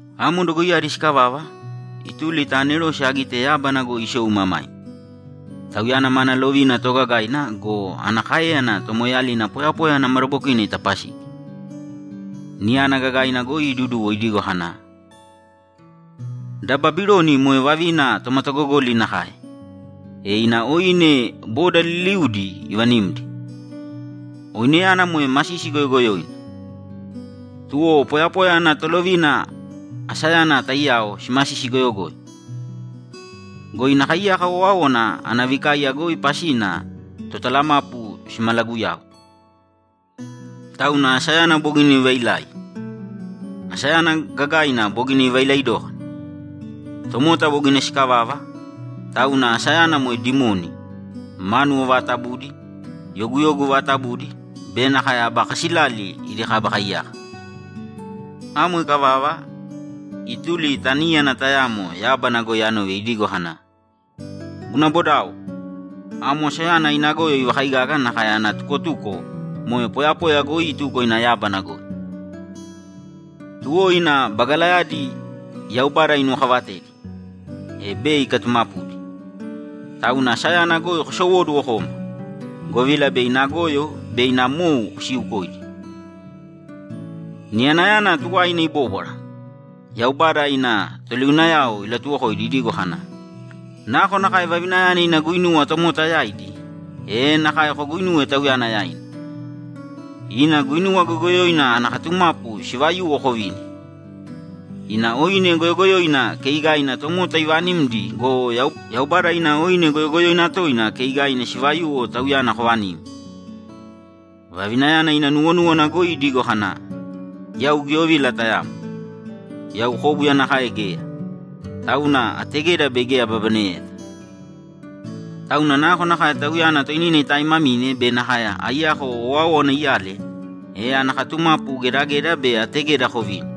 Amo dogoiyadi sikavava, ituli ta anerose agite yábana goi isou imamaima. Tauyana mana lovina toogagaina go, ana káeyana tomoeeyalina poyapoya ana madabokina itapasigi. Niyana gagaina goi iduduwo idigo kana, ‘Da Babiloni moe vavina tomatagogoli nakae, e ina oine boda liliudi ivanimdi, oineyana moe masisi goyogoyoina! Tuwo poyapoya ana tolovina asayana taiyao simasisi goyogoyo. Go ina kaiyaka owáowana ana vikaiya goi pasina totalamapu simalaguyau. Tauna asayana bogina ivailai! Asayana gagaina bogina ivailai dókana! Tomota bogina sikavava, tauna asayana moe dimoni, mánuwo vaatabudi, yoguyogu vaatabudi be nakae aba kasilali idi kaba kaiyaka.’ Amo ikavava, ituli ta níyana tayamo yábana goi anove idigo kana, ‘Guna bodao, Amo asayana ina goyo ivakaigaga nakae ana tukotuko moe poyapoya goi ituko ina yábana goi. Tuwo ina bagalayadi Yaubada inuwokavatedi, e bei ikatumapudi. Tauna asayana goi kosowōduwo kōma, govila bei ina goyo be ina mou kosiukoidi.’ Niyanayana tuwaina ibóbwara, Yaubada ina toliunayao ilatuwokoidi idigo kana, ‘Nakonakae vavinayana ina guinuwa tomota yaidi, e nakae koguinūwe tauyana yaina. Ina guinuwa goyogoyoina ana katumapu sivayuwo kovīni. Ina oine goyogoyoina keigaina tomota ivanimdi go, Yaubada ina oine goyogoyoina toina keigaina sivayuwo tauyana kovanīm. Vavinayana ina nuwonúwana goi idigo kana, “Yau giyovila tayamo. Yau kóbuya nakae geya, tauna ategeda bei geya ababaneyeta.” Tauna nakonakae tauyana toinina itaimamine be nakae aiyako owáowana iyale, e ana katumapu gedageda be ategeda kovīni.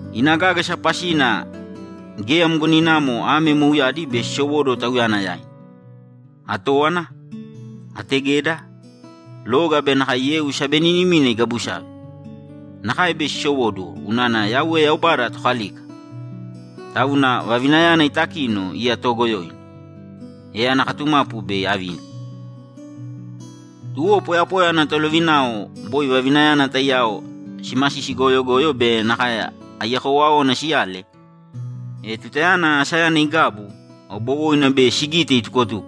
Ina gágasa pasina geya mgoninamo ame mouyadi bei sisowóduwo tauyana yaina: Atówana, ategeda, loga be nakae yeu sabeninimina igabusave. Nakae bei sisowóduwo unana Yauwe Yaubada Tokalika, tauna vavinayana itakino iya toogoyoina, e ana katumapu bei avini.’ Tuwo poyapoya ana tolovinao boi vavinayana taiyao simasisi goyogoyo be nakae aiyako owáowana siyale, e tutayana asayana igabu, aubowoina bei sigite itukotuko,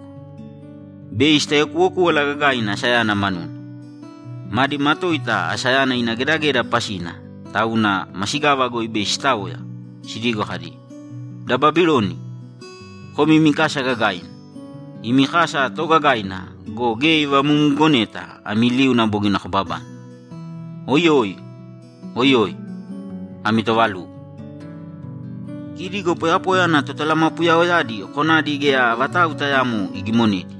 bei sitaiyakuwokúwala gagaina asayana manuna. Madi matoita asayana ina gedageda pasina, tauna masigava goi bei sitaoya, sidigo kadi, ‘Da Babiloni, Komi imi kasa gagaina. Imi kasa toogagaina go, geya ivamumugoneta ami liuna bogina kobabane. Oiyoi, oiyoi! Ami toovalugo!’ Kidi go poyapoya ana totalamapuyaoyadi konadi geya vatau tayaamo igimonedi,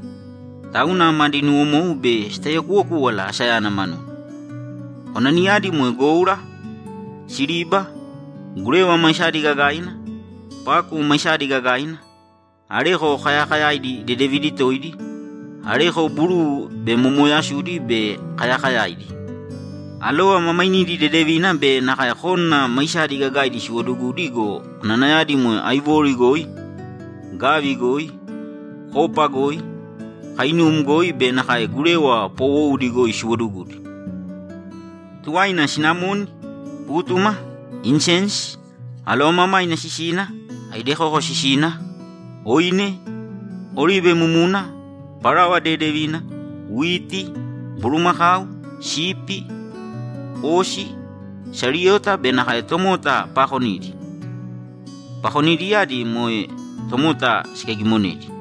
tauna madi nuwomou bei sitaiyakuwokúwala asayana manuna. Konadiyadi moe goura, siriba, gurewa maisadi gagaina, paku maisadi gagaina, areko kayakayaidi dedevidi toidi, areko buruu be momooyasudi be kayakayaidi, alova ma mainidi dedevina be nakae kónana maisadi gagaidi siwodugudi go, konanayadi moe áivori goi, gavi goi, kopa goi, kainum goi be nakae gurewa poowoudi goi siwodugudi. Tuwaina sinamoni, pútuma, insensi, alovamamaina sisina, aidekoko sisina, oine, oribe mumuna, parawa dedevina, witi, bulumakau, sipi, osi, sariyota be nakae tomota paakonidi; pakonidiyadi moe tomota sikaigimonedi.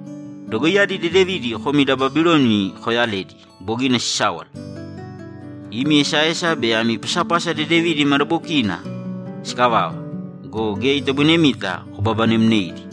Dogoiyadi dedevidi komi da Babiloni kooyaledi bogina sisáwala! Imi esaesa be ami pasapasa dedevidi madabokiina sikavava go, geya itoboinemita kobabanemneidi!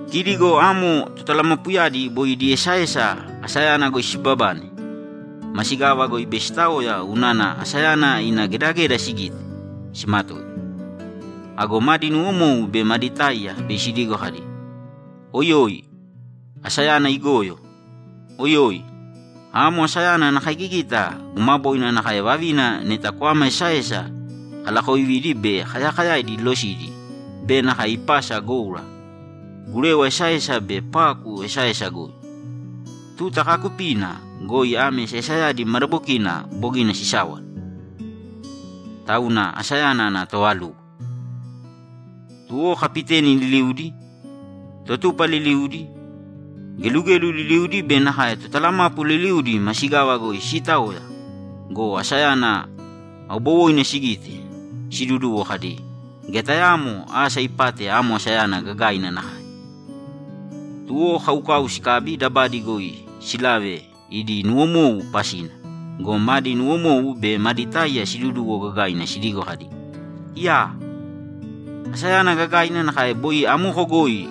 Kidi go amo totalamapuyadi boi idi esaesa asayana goi siibabane, masigava goi bei sitaoya unana asayana ina gedageda sigite, simatoita. Ago madi nuwomou be madi táiya bei sidigo kadi, ‘Oiyoi, asayana igoyo! Oiyoi! Amo asayana ana kaigigita gumaboina nakae vavina neta kwama esaesa kalaakovidi be kayakayaidi ilosidi be nakae ipasa goura, gurewa esaesa be paku esaesa goi. Tuta kaakupiina goi ame esaesayadi madabokina bogina sisáwala. Tauna asayana ana toovalugo!’ Tuwo kapiteni liliudi, totupa liliudi, gelugelu liliudi be nakae totalamapu liliudi masigava goi siitaoya go, asayana aubowoina sigite, siduduwo kadi, ‘Geya tayaamo asa ipate amo asayana gagaina nakae.’ Tuwo kaukau sikabi dabadi goi silave idi nuwomou pasina go, madi nuwomou be madi táiya siduduwo gagaina sidigo kadi, ‘Iyaa! Asayana gagaina nakae boi amoko goi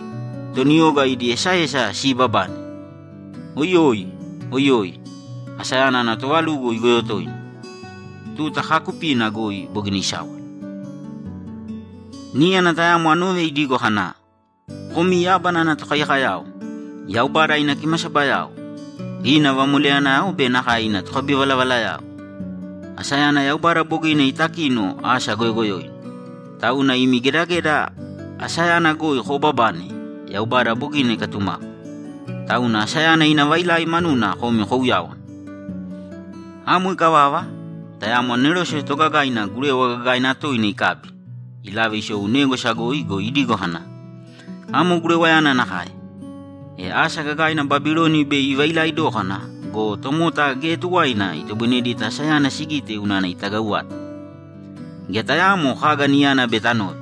toni oga idi esaesa siibabane. Oiyoi! oiyoi! Asayana ana tovalugo igoyo toina. Tuta kaakupiina goi bogina isáwala.’ Níyana tayamo anove idigo kana, ‘Komi yábana ana tokaiyakoyao, Yaubada ina kimasabayao, ina vamoleyanayao be nakae ina tokabivalavalayao, Asayana Yaubada bogina itakino asa goyogoyoina, tauna imi gedageda asayana goi koobabane Yaubada bogina ikatumapu. Tauna asayana ina vailai manuna komi kouyāwana!’ Amo ikavava, tayamo anerose toogagaina gurewa gagaina toina ikabi, ilave isou négwasa goi go, idigo kana, ‘Amo gurewayana nakae, e asa gagaina Babiloni bei ivailai dókana go, tomota geya tuwaina itoboinedita asayana sigite unana itagau vata. Geya tayaamo kaga niyana bei tanove.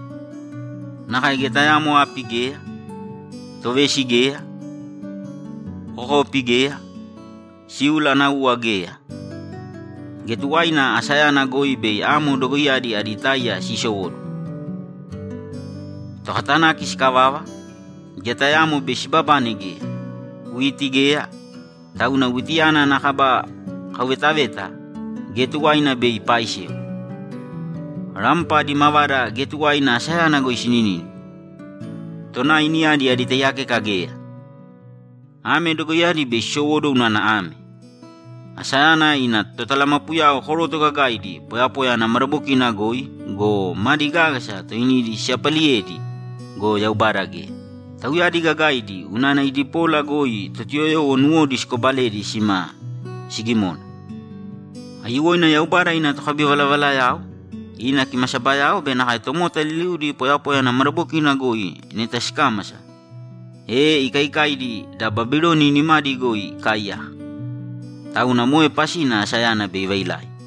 Nakae geya tayaamo api geya, tovesi geya, kokopi geya, síula ana uwa geya. Geya tuwaina asayana goi bei amo dogoiyadi adi táiya siisowóduwo. Tokatanaki sikavava; geya tayaamo bei sibabane geya. Witi geya, tauna witiyana ana kaba kauvetaveta geya tuwaina bei ipaaisewa. Rampa adi mavada geya tuwaina asayana goi sinínima. Tonai niyadi adi taiyakeka geya. Ame dogoiyadi bei sisowóduwo unana ame: Asayana ina totalamapuyao koroto gagaidi poyapoya ana madabokina goi go, madi gágasa toinidi siyapaliyedi go, Yaubada geya. Tauyadi gagaidi unana idi pola goi Totuyoyowo nuwodi sikobaledi sima sigimona. Aiyuwoina Yaubada ina tokabivalavalayao, ina kimasabayao be nakae tomota liliudi poyapoya ana madabokina goi neta sikámasa, e ikaikaidi da Babiloni nimadi goi ikaaiyaka. Tauna moe pasina asayana bei ivailai.’